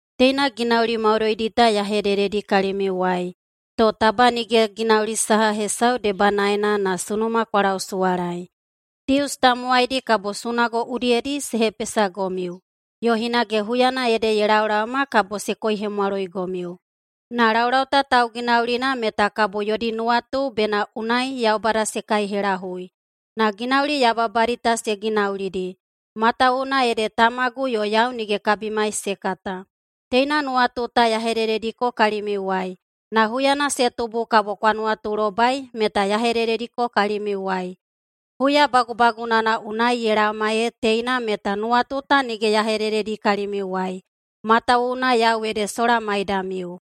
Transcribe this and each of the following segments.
Teina ginauli maudoidi ta ya hedededi kalimiuwai, to taba nige [ginauli saha hesau debanaena na] sunuma kwa lausuwalaei. Dius tamowaidi kabo sunago udiyedi se hepesagomiu. Yo hinage huyana ede ye laolaoma kabo se koihemwaloigomiu. Na laulau ta tauginaulina meta kabo yodi nuwatu bena unai Yaubada se kaihelahui. Na ginauli yababadi ta se ginaulidi, matawuwuna ede Tamagu yo yau nige kabimai se kata. Teina nuwatu ta ya hededediko kalimiuwai, na huyana se tubu kabo kwa nuwatulobai meta ya hededediko kalimiuwai. Huya bagubagunana unai ye laoma ee teina meta nuwatu ta nige ya hedededi kalimiuwai, matawuwuna yau ede sola maidamiu.”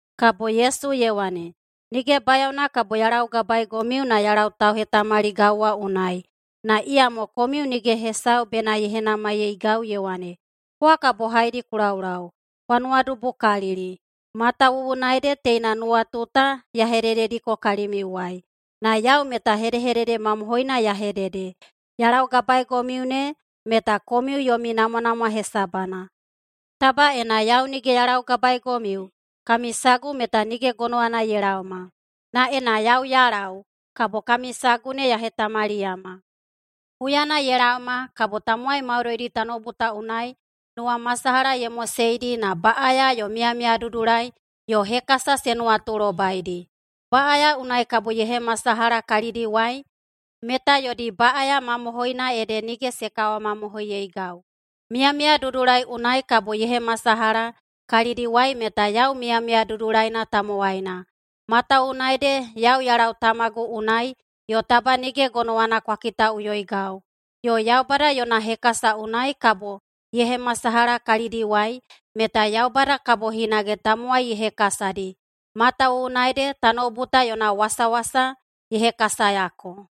[Kabo Yesu ye wane,] “Nige bayaona kabo ya laugabaegomiu na ya lau tauhetamaligau wa unai, na iyamo komiu nige hesau bena ye henamaiyeigau ye wane, ‘Kowa kabo haedi ku laulau?’ Kwa nuwadubukalili, matawuwuna ede teina nuwatu ta ya hededediko kalimiuwai. Na yau meta hedehedede mamohoina ya hedede: Ya laugabaegomiu ne meta komiu yomi namwanamwa hesabana. Taba ena yau nige ya laugabaegomiu, kami sagu meta nige gonowana ye laoma. Na ena yau ya lau, kabo kami sagu ne ya hetamaliyama. Huyana ye laoma kabo tamowai maudoidi tanoubu ta unai nuwamasalaha ye moseidi na baꞌaya yo miyamiyadudulai yo hekasa se nuwatulobaidi. Baꞌaya unai kabo ye hemasalaha kalidiwai meta [yodi baꞌaya mamohoina ede] nige se kawamamohoiyeigau. Miyamiyadudulai unai kabo ye hemasalaha kalidiwai meta [yau miyamiya dudulaina tamowaina,] matawuwuna ede yau ya lau Tamagu unai, yo taba nige gonowana kwa kitaꞌuyoigau. Yo Yaubada yona hekasa unai kabo ye hemasalaha kalidiwai [meta Yaubada kabo hinage tamowai ye hekasadi,] matawuwuna ede tanoubu ta yona wasawasa ye hekasayako.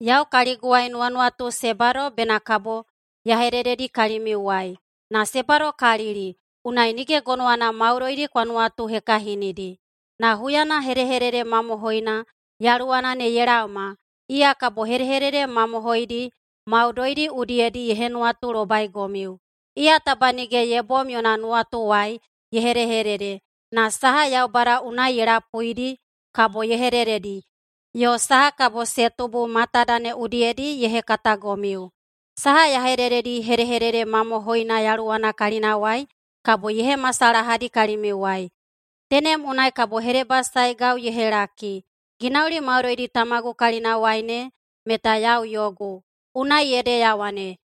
Yau kaliguwai nuwanuwatu se bado bena kabo ya hedededi kalimiuwai. Na se badokalili, unai nige gonowana maudoidi kwa nuwatuhekahinidi. Na huyana hedehedede mamohoina Yaluwana ne ye laoma, iya kabo hedehedede mamohoidi maudoidi udiyedi ye henuwatulobaigomiu. Iya taba nige ye bom yona nuwatuwai ye hedehedede, na saha Yaubada unai ye lapuidi kabo ye hedededi, yo saha kabo se tubu matada ne udiyedi ye hekatagomiu. Saha ya hedededi hedehedede mamohoina Yaluwana kalinawai, kabo ye hemasalahadi kalimiuwai. Tenem unai kabo hedebasaegau ye helaki. Ginauli maudoidi Tamagu kalinawai ne meta yau yogu. Unai ede ya wane,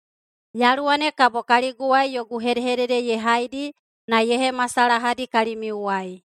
‘Yaluwa ne kabo kaliguwai yogu hedehedede ye haidi na ye hemasalahadi kalimiuwai.’”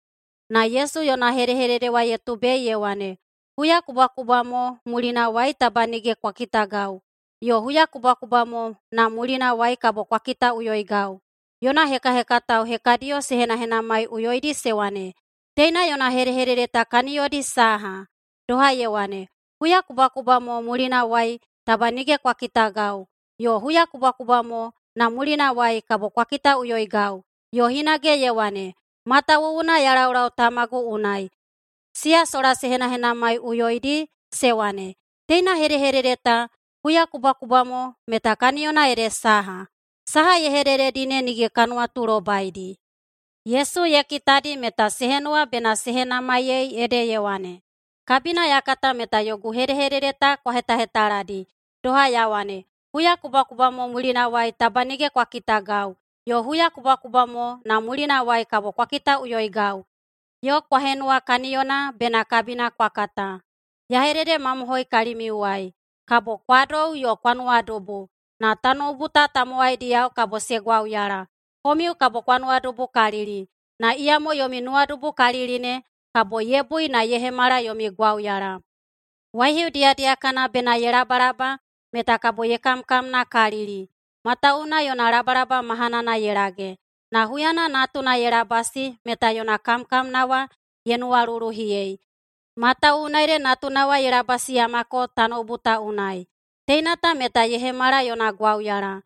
[Na Yesu yona hedehedede wa ye tubei ye wane,] “Huyakubwakubwa mo mulinawai taba nige kwa kitagau, yo huyakubwakubwa mo na mulinawai kabo kwa kitaꞌuyoigau.” Yona hekahekatao hekadiyo se henahenamaiꞌuyoidi se wane, “Teina yona hedehedede ta kaniyodi saha? Doha ye wane, ‘Huyakubwakubwa mo mulinawai taba nige kwa kitagau, yo huyakubwakubwa mo na mulinawai kabo kwa kitaꞌuyoigau.’ Yo hinage ye wane, ‘Matawuwuna ya laulau Tamagu unai.’” Siya sola se henahenamaiꞌuyoidi se wane, “Teina hedehedede ta ‘Huyakubwakubwa mo’ meta kaniyona ede saha? Saha ye hedehedededi ne nige ka nuwatulobaidi.” Yesu ye kitadi meta se henuwa bena se henamaiyei ede ye wane, “Kabina ya kata meta yogu hedehedede ta kwa hetahetaladi, doha ya wane, ‘Huyakubwakubwa mo mulinawai taba nige kwa kitagau, yo huyakubwakubwa mo na mulinawai kabo kwa kitaꞌuyoigau.’ Yo kwa henuwa kaniyona bena kabina kwa kata. Ya hededemamohoi kalimiuwai: Kabo kwa dou yo kwa nuwadubu, na tanoubu ta tamowaidiyao kabo se gwauyala. Komiu kabo kwa nuwadubukalili, na iyamo yomi nuwadubukalili ne kabo ye bui na ye hemala yomi gwauyala. Waihiu diyadiyakana bena ye labalaba meta kabo ye kamkamnakalili, matawuwuna yona labalaba mahanana ye lage. Na huyana natuna ye labasi meta yona kamkamna wa ye nuwaluluhiyei, matawuwuna ede natuna wa ye labasiyamako tanoubu ta unai. Teina ta meta ye hemala yona gwauyala.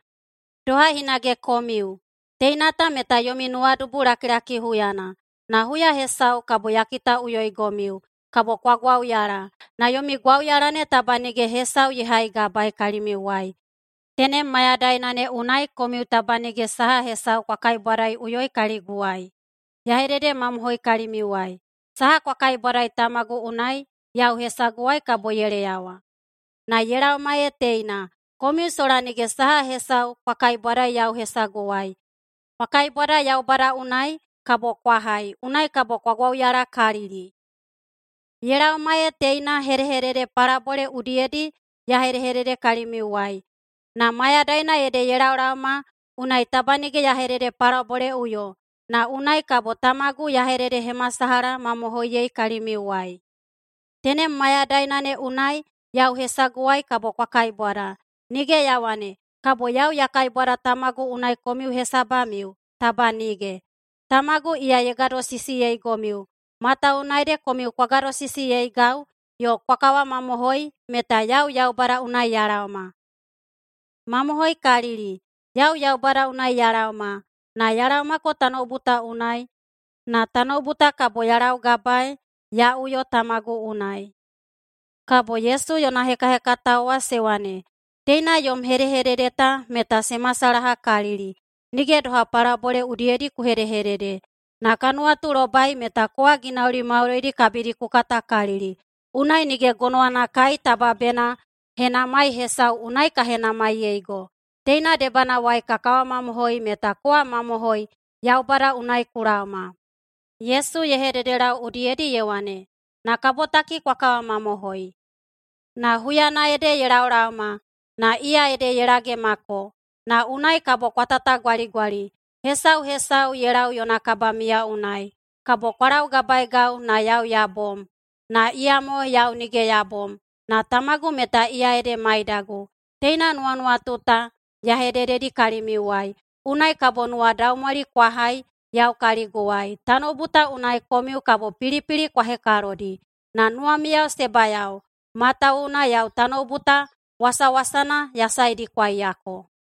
Doha hinage komiu: Teina ta meta yomi nuwadubulakilaki huyana. Na huya hesau kabo ya kitaꞌuyoigomiu. Kabo kwa gwauyala, na yomi gwauyala ne taba nige hesau ye haigabaei kalimiuwai. Tenem mayadaina ne unai komiu taba nige saha hesau kwa kaibwadaiꞌuyoi kaliguwai. Ya hededemamohoi kalimiuwai: Saha kwa kaibwadai Tamagu unai yau hesaguwai kabo ye leyawa. Na ye laoma ee teina, komiu sola nige saha hesau kwa kaibwadai yau hesaguwai. Kwa kaibwada Yaubada unai, kabo kwa hai, unai kabo kwa gwauyalakalili. Ye laoma ee teina hedehedede palabole udiyedi ya hedede kalimiuwai. Na mayadaina ede ye laolaoma unai taba nige ya hededepalaboleꞌuyo, na unai kabo Tamagu ya hededehemasalahamamohoiyei kalimiuwai. Tenem mayadaina ne unai yau hesaguwai kabo kwa kaibwada. Nige ya wane, kabo yau ya kaibwada Tamagu unai komiu hesabamiu. Taba nige! Tamagu iya ye gadosisiyeigomiu, matawuwuna ede komiu kwa gadosisiyeigau yo kwa kawamamohoi meta yau Yaubada unai ya laoma. Mamohoikalili, yau Yaubada unai ya laoma, na ya laomako tanoubu ta unai. Na tanoubu ta kabo ya laugabaei ya uyo Tamagu unai.” Kabo Yesu yona hekahekatao wa se wane, “Teina yom hedehedede ta meta se masalahakalili, nige doha palabole udiyedi ku hedehedede. Na ka nuwatulobai meta kowa ginauli maudoidi kabidi ku katakalili. Unai nige gonowana kai taba bena henamai hesau unai ka henamaiyeigo. Teina debanawai ka kawamamohoi meta kowa mamohoi Yaubada unai ku laoma.” Yesu ye hededelau udiyedi ye wane, “Na kabotaki kwa kawamamohoi! Na huyana ede ye laolaoma, na iya ede ye lagemako, na unai kabo kwa tatagwaligwali, hesau hesau ye lau yona kabamiya unai. Kabo kwa laugabaeigau na yau ya bom. Na iyamo yau nige ya bom, na Tamagu meta iya ede maidagu. Teina nuwanuwatu ta ya hedededi kalimiuwai, unai kabo nuwadaumwali kwa hai yau kaliguwai. Tanoubu ta unai komiu kabo pilipili kwa hekalodi. Na nuwamiu se bayao! Matawuwuna yau tanoubu ta wasawasana ya saedikwaiyako.”